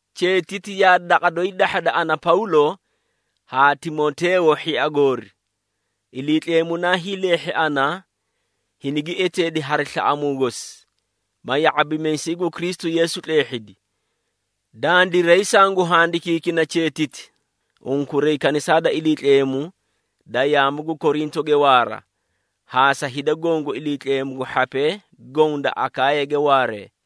Cheetiti yaa daqa doyi dahhada, ana Pawlo haa Timoteeyo hhia goori. Iliitleemu naa hiileehhi ana, hinigi eteedi hari slaꞌamuu gosi, ma ya⁄abimiisay gu Kristu Yeesu tleehhidi. Dandiray sangu handikiikina cheetiti unkuray kanisaa da Iliitleemu da yaamu gu Korintoge waara, haa sa hida goõ gu Iliitleemu gu hhapee goõ da Akaayage waaree.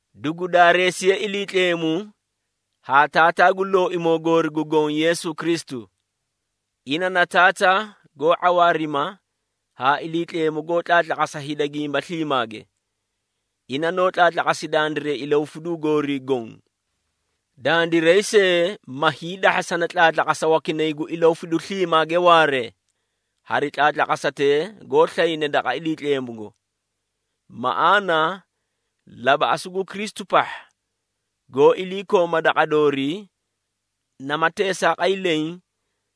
Dugu daareesiye Iliitleemu haa Taataa gu Looimoo goori gu Goõ Yeesu Kristu. Ina na Taataa goó ⁄awaarima haa Iliitleemu goó tlaatlaqasa hida gimba sliimaage. Ina noó tlaatlaqasi dandiray ilahufiduu goorii goõ. Dandiray see, ma hiidahhasani tlaatlaqasa wakinay gu ilahufidu sliimaage waaree, hari tlaatlaqasatee goó slayne daqa Iliitleemugo. Maꞌaana, labaꞌasu gu Kristu pahha goó ilakooma daqa doorii, nama teesaaqay leẽ,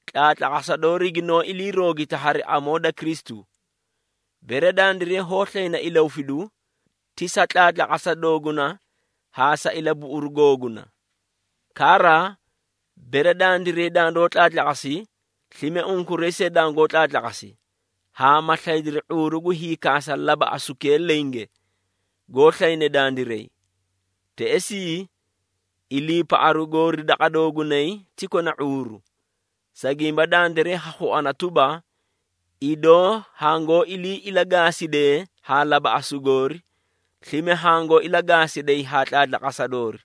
tlaatlaqasa doori ginoó ilii roogita hari amoo da Kristu. Bere dandiray hoó slayna ilahufidu, ti sa tlaatlaqasa dooguna haa sa ilabuꞌuru googuna. Kara, bere dandiray dandoó tlaatlaqasi, slime unkuray see dangoó tlaatlaqasi, haa ma slaydiri ⁄uuru gu hiikaasa labaꞌasukee lenge, goó slayne dandiray. Teꞌesii, iliipaꞌaru goori daqa doogunay ti kona ⁄uuru, sa gimba dandiray ha khuana tuba, idoo hangoó ilii ilagaasidee haa labaꞌasu goori, slime hangoó ilagaasiday haa tlaatlaqasa doori.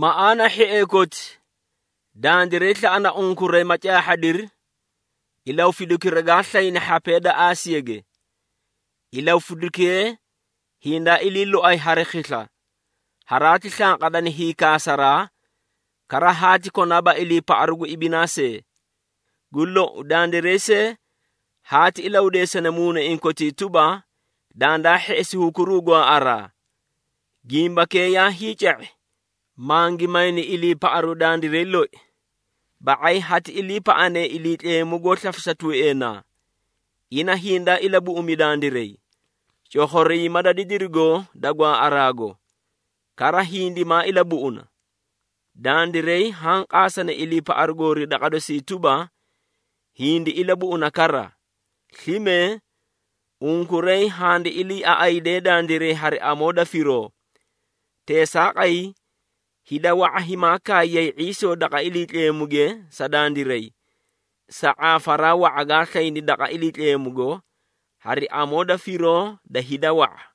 Maꞌaana hhiee koti, dandiray slaꞌana unkuray ma caahhadiri ilahufidukira gaa slayni hhapee da Aasiyage. Ilahufidukee hindaa ilii loay hari khisla, haraati slanqadani hiikaasaraa, kara haati konaaba iliipaꞌaru gu ibinaa see. Gu lou, dandiray see haati ilahudeesani muunaiĩ kotii tuba, dandaa hheꞌesi hukuruu gwaaꞌaraa. Gimbakee yaa hiica⁄i, mangi mayni iliipaꞌaru dandiray loi, ba⁄ay hati iliipaꞌane Iliitleemu goó slafisa tuueenaa. Ina hindaa ilabuꞌumi dandiray, cokhoriima da didirigo da gwaaꞌaraago, kara hindimaa ilabuꞌuna. Dandiray haã qaasani iliipaꞌaru goori daqa dosii tuba, hindi ilabuꞌuna kara. Slime, unkuray handi iliiaꞌaaꞌadee dandiray hari amoo da firoo. Teesaaqay, hida wa⁄a himaa kaayiyay ⁄iisoo daqa Iliitleemuge sa dandiray, sa ⁄aafaraa wa⁄a gaa slayni daqa Iliitleemugo, hari amoo da firoo da hida wa⁄a.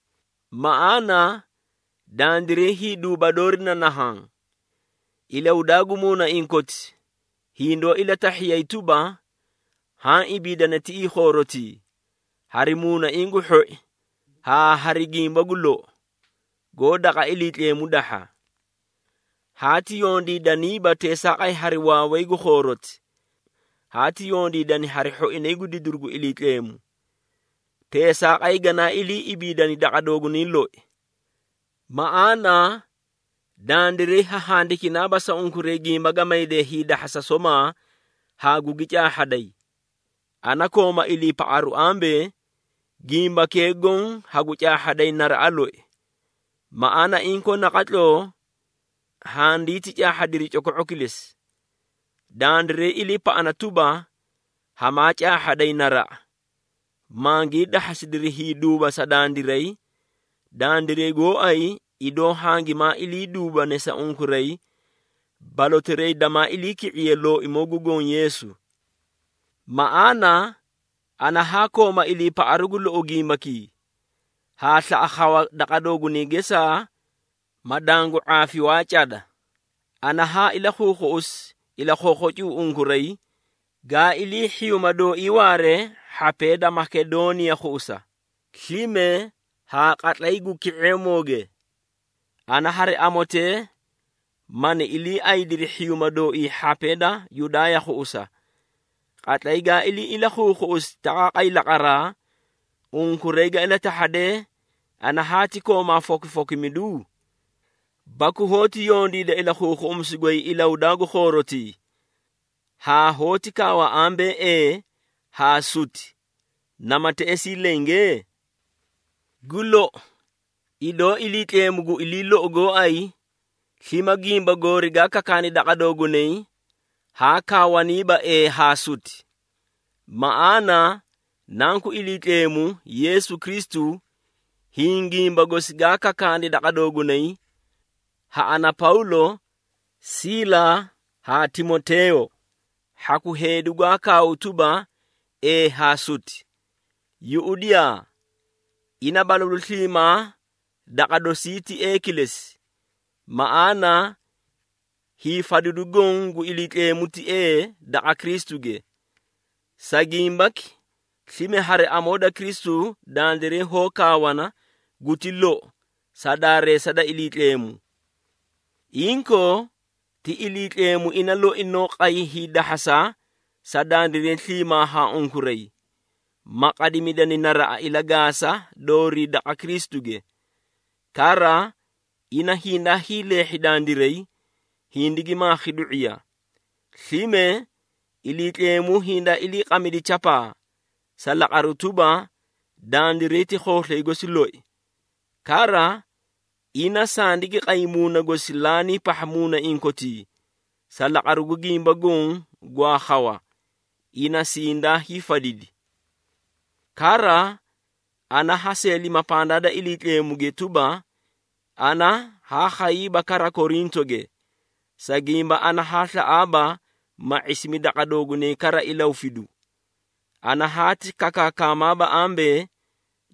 Maꞌaana, dandiray hiiduuba doori na nahaã. Ilahudaa gu muunaiĩ koti hindoó ilatahhiyay tuba, haã ibiidani tiꞌii khoorotii, hari muunaiĩ gu hhoi haa hari gimba gu lou, goó daqa Iliitleemu dahha. Haati yondiidaniiba teesaaqay hari waaway gu khooroti, haati yondiidani hari hhoinay gu didiru gu Iliitleemu. Teesaaqay ganaa ilii ibiidani daqa doogunay loi. Maꞌaana, dandiray ha handikinaaba sa unkuray gimba ga maydee hiidahhasa somaa haa gugi caahhaday. Ana kooma iliipaꞌaru ambee, gimbakee goõ hagu caahhaday naraꞌa loi, maꞌaana inkoo naqatloo handinti caahhadiri coko⁄o kilesi. Dandiray iliipaꞌana tuba, hamaa caahhaday naraꞌa, mangii dahhasidiri hiiduuba sa dandiray, dandiray gooay idoo hangimaa ilii hiiduubane sa unkuray balotirayi damaa iliiki⁄iye Looimoo gu Goõ Yeesu. Maꞌaana, ana haa koomaa iliipaꞌaru gu lou gimbakii, haa slaꞌa khawa daqa doogunay gesaa, ma dangu ⁄aafi waa cada. Ana haa ilakhuukhuꞌusi ilakhookhocu unkuray, ga ilii hhiyuuma dooii waare hhapee da Makedooniya khuꞌusa, slime haa qatlay gu ki⁄eemooge. Ana hari amotee mani iliiaydiri hhiyuuma dooii hhapee da Yudaaya khuꞌusa. Qatlay gaa ilii ilakhuukhuꞌusi taqaaqay laqaraa, unkuray ga ilatahhadee ana haati koomaa fokifokimidu? Baku hoóti yondiida ilakhuukhuꞌumisu goy ilahudaa gu khoorotii, haa hoóti kaawa ambee, “Ee” haa “Suti” nama teꞌesii lenge? Gu lou, idoo Iliitleemu gu ilii lou gooay, slime gimba goori gaa kakaani daqa doogunay haa kaawaniiba “Ee” haa “Suti.” Maꞌaana, Nanku Iliitleemu, Yeesu Kristu, hiĩ gimba gosi gaa kakaani daqa doogunay, ha ana Pawlo, Siila haa Timoteeyo, hhaku heedi gwaa kaaw tuba, “Ee” haa “Suti.” Yuꞌudiyaa! Ina balalu sliimaa daqa dosii ti “Ee” kilesi. Maꞌaana, hiifadidu goõ gu Iliitleemu ti “Ee” daqa Kristuge. Sa gimbaki, slime hari amoo da Kristu dandiray hoó kaawana “Guti lou” sa daareesa da Iliitleemu. Inkoo, ti Iliitleemu ina loi noó qay hiidahhasa sa dandiray sliimaa haa unkuray, ma qadimidani naraꞌa ilagaasa doorii daqa Kristuge. Kara, ina hindaa hiileehhi dandiray, hindigi maakhi du⁄iya. Slime, Iliitleemu hindaa iliiqamidi chapaa, sa laqaru tuba, dandiray ti khooslay gosi loi. Kara ina sandigi qay Muuna gosi laanii pahha muunaiĩ kotii, sa laqaru gu gimba goõ gwaa khawa, ina sindaa hiifadidi. Kara, ana ha seelima pandaa da Iliitleemuge tuba, ana haa khayiiba kara Korintoge, sa gimba ana haa slaꞌaaba, ma ⁄isimi daqa doogunay kara ilahufidu. Ana hati kakaakamaaba ambee,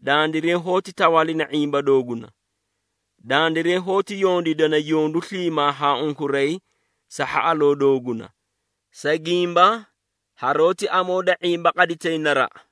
dandiray hoóti tawaalina ⁄imba dooguna. Dandiray hoóti yondiidana yondu sliimaa haa unkuray sa hhaꞌaloo dooguna, sa gimba haroóti amoo da ⁄imba qaditay naraꞌa.